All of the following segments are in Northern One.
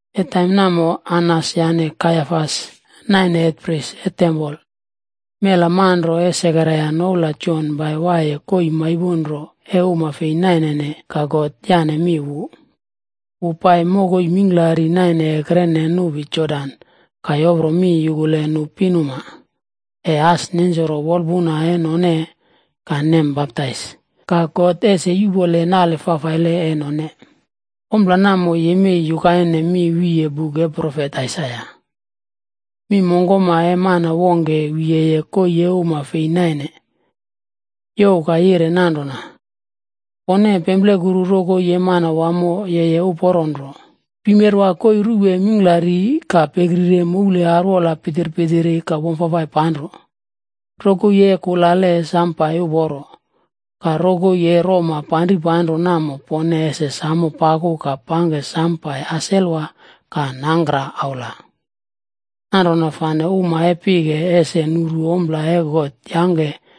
E taim namo Anas yane Kaiafas naine hetprisa e tempol. Mela manro e Sekaraia noula Jon pai waiye koii maipon nro e uma fei nainene ka God yane mi wu. Wu pai mokoi mingklari naine ekrene nupi Jodan ka yopro mi yukule nu pinuma ese as nensoro wolpuna e none ka nem baptais, ka God ese yuꞌpole nale fafaile e none. Ompla namo yemei yukaine mi wiye buk e profet Aisaia: “Mi mongkoma e mana wongke wiyeye koii e uma fei naine, youw ka yire nanrona, ‘Pone pemplekuru rokoi e Manawamo yeye uporo nro. Pimerwa koii ruwe mingklari ka pekrire moule arwola pitpitiri ka wamfafai panro. Rokoi e kulale pangke pai uporo, ka rokoi e roma panripanro namo pone ese samo paku ka samo pangke pai uporo ka nangkra aula. Nanrona fane uma e pike ese nuru ompla e God yangke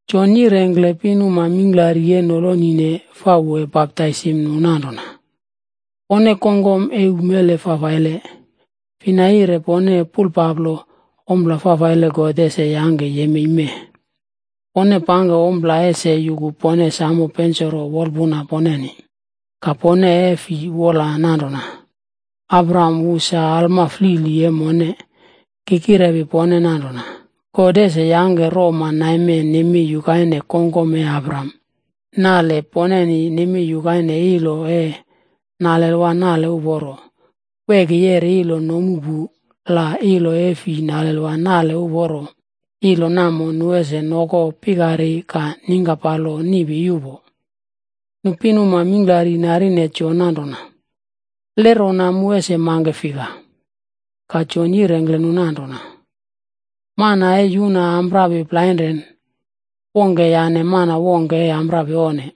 Jon yirengkle pinuma mingklari e nolonine fa wu e baptaisim nu nanrona, “Pone kongkom e umele fafaile, fina yire pone pulpaplo ompla fafaile God ese yangke yemei mee? Pone pangke ompla ese yuku pone samo pensoro wolpuna poneni. Ka pone e fi wola nanrona, ‘Abraham wu sa alma flili e mone.’ Ki kirepi pone nanrona God ese yangke roma naime nemei yukaine kongkom e Abraham. Nale poneni nemei yukaine ilo e nalelwa nale uporo. Weki yeri ilo nomu pu la ilo e fi nalelwa nale uporo, ilo namo nu ese noko pikari ka ningkapalo niꞌpi yuꞌpo.” Nu pinuma mingklari narine Jon nanrona, “Le mu ese mangke fika?” Ka Jon yirengkle nu nanrona, “Mana e yuna amprapi plainre, wongke yane mana wongke e amprapi onne.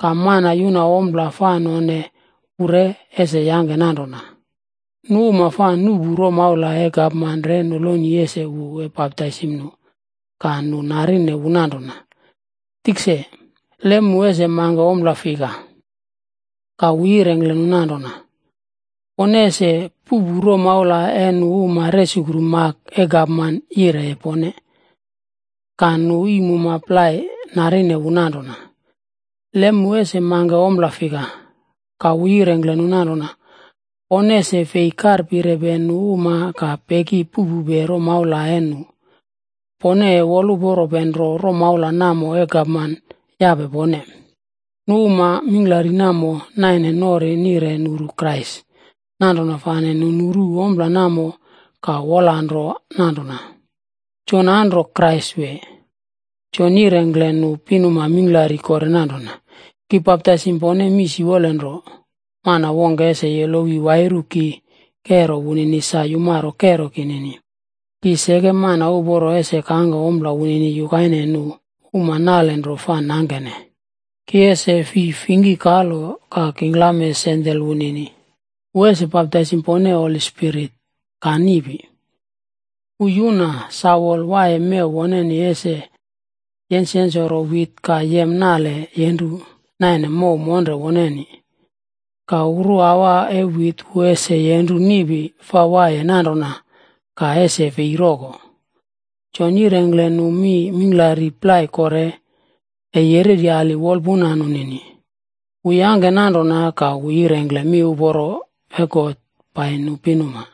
Ka mana yuna ompla fa none wu re ese yangke nanrona.” Nu uma fa nuꞌpu romaula e gapman re noloni ese wu e baptaisim nu. Ka nu narine wu nanrona, “Tikse, le mu ese mangke ompla fik?” Ka wu yirengkle nu nanrona, “Pone ese puꞌpu romaula e nu uma resukru mak e gapman yireye pone.” Ka nu iim uma plai narine wu nanrona, “Le mu ese mangke ommo fika?” Ka wu yirengkle nu nanrona, “Pone ese fei karpirepe nu uma ka peki puꞌpupe romaula e nu. Pone e woluporope nro romaula namo e gapman yape pone.” Nu uma mingklari namo naine nori nire nuru Krais. Nanrona fane nu nuru ompla namo, ka wolanro nanrona, “Jon anro, Jon yirengkle nu pinuma mingklari kore nanrona, “Ki baptaisim pone mii siwolenro, mana wongke ese yolowi wairu ki kero wunini sa yumaro kero kinini. Ki seke mana uporo ese kangke ompla wunini yukaine nu uma nalenro fa nangkene, ki ese fi fingki kalo ka kingklame sandel wunini. Wu ese baptaisim pone Holi Spirit ka niꞌpi. Wu yuna sawol waiye mew woneni ese yensyensoro wit ka yem nale yenru naine mow monre woneni. Ka uruawa e wit wu ese yenru niꞌpi fa waiye nanrona ka ese fei roko.” Jon yirengkle nu mi mingklari plai kore, e yereryali wolpuna nunini. Wu yangke nanrona ka wu yirengkle miuporo e God pai nu pinuma.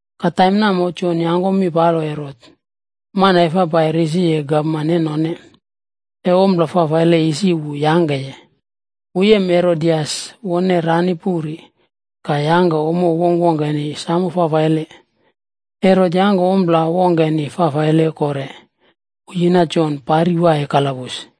Ka taim namo, Jon yenre Herot, mana e fa pai risiye gapman e none, e ompla fafaile isi wu yangkeye. Wu yem Herodias, wone rani puri, ka yangke ommo wongkwongkeni samo fafaile. Herot yangke ompla wongke fafaile kore, wu yina Jon pari waiye kalabus.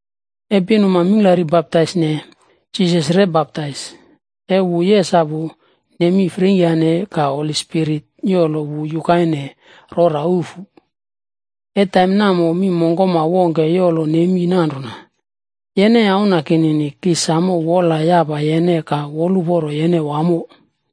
E pinuma mingklari baptaisne, Jisas re baptais. E wu yesapu, nemi freingkyane. Ka Holi Spirit yolo wu yukaine rora ufu. E taim namo mi mongkoma wongke yolo nemi nanrona, “Yene Auna kinini, ki samo wola yapa yene ka woluporo yene wamo.”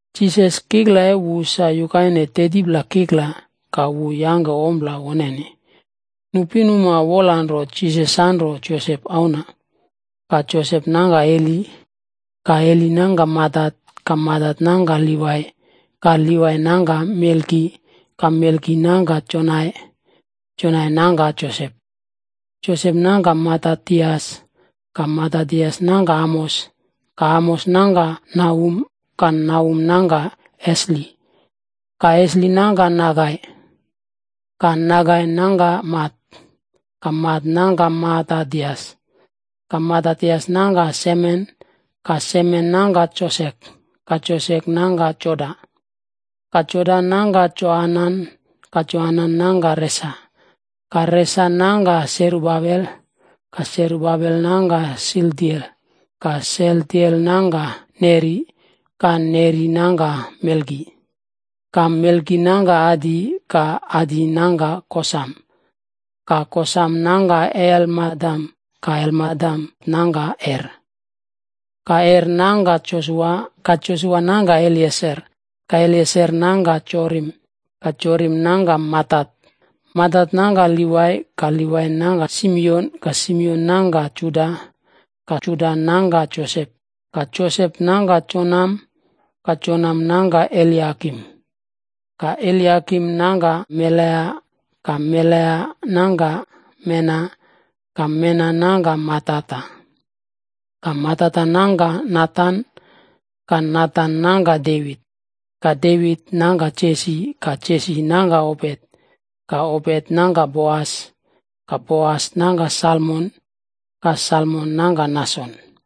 Jisas, kikla e wu sa yukaine 30pla kikla, ka wu yangke ompla woneni. Nu pinuma wolanro Jisas sanro Josep auna. Ka Josep nangka Heli. Ka Heli nangka Matat, ka Matat nangka Livai, ka Livai nangka Melki, ka Melki nangka Janai. Janai nangka Josep. Josep nangka Matatias, ka Matatias nangka Amos, ka Amos nangka Nahum, ka Nahum nangka Esli, ka Esli nangka Nagai. Ka Nagai nangka Mat, ka Mat nangka Matatias, ka Matatias nangka Semen, ka Semen nangka Josek, ka Josek nangka Joda. Ka Joda nangka Joanan, ka Joanan nangka Resa, ka Resa nangka Serubabel, ka Serubabel nangka Sealtiel, ka Sealtiel nangka Neri. Ka Neri nangka Melki, ka Melki nangka Adi, ka Adi nangka Kosam, ka Kosam nangka Elmadam, ka Elmadam nangka Er. Ka Er nangka Josua, ka Josua nangka Elieser, ka Elieser nangka Jorim, ka Jorim nangka Matat, Matat nangka Livai. Ka Livai nangka Simion, ka Simion nangka Juda, ka Juda nangka Josep, ka Josep nangka Jonam, ka Jonam nangka Eliakim. Ka Eliakim nangka Melea, ka Melea nangka Mena, ka Mena nangka Matata, ka Matata nangka Natan, ka Natan nangka Devit. Ka Devit nangka Jesi, ka Jesi nangka Obet, ka Obet nangka Boas, ka Boas nangka Salmon, ka Salmon nangka Nason.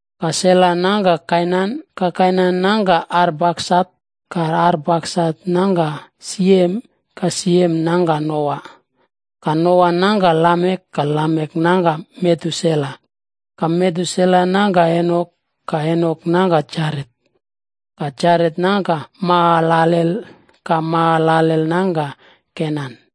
Ka Sela nangka Kainan, ka Kainan nangka Arpaksat, ka Arpaksat nangka Siem, ka Siem nangka Noa, ka Noa nangka Lamek. Ka Lamek nangka Metusela, ka Metusela nangka Enok, ka Enok nangka Jaret, ka Jaret nangka Mahalalel, ka Mahalalel nangka Kenan.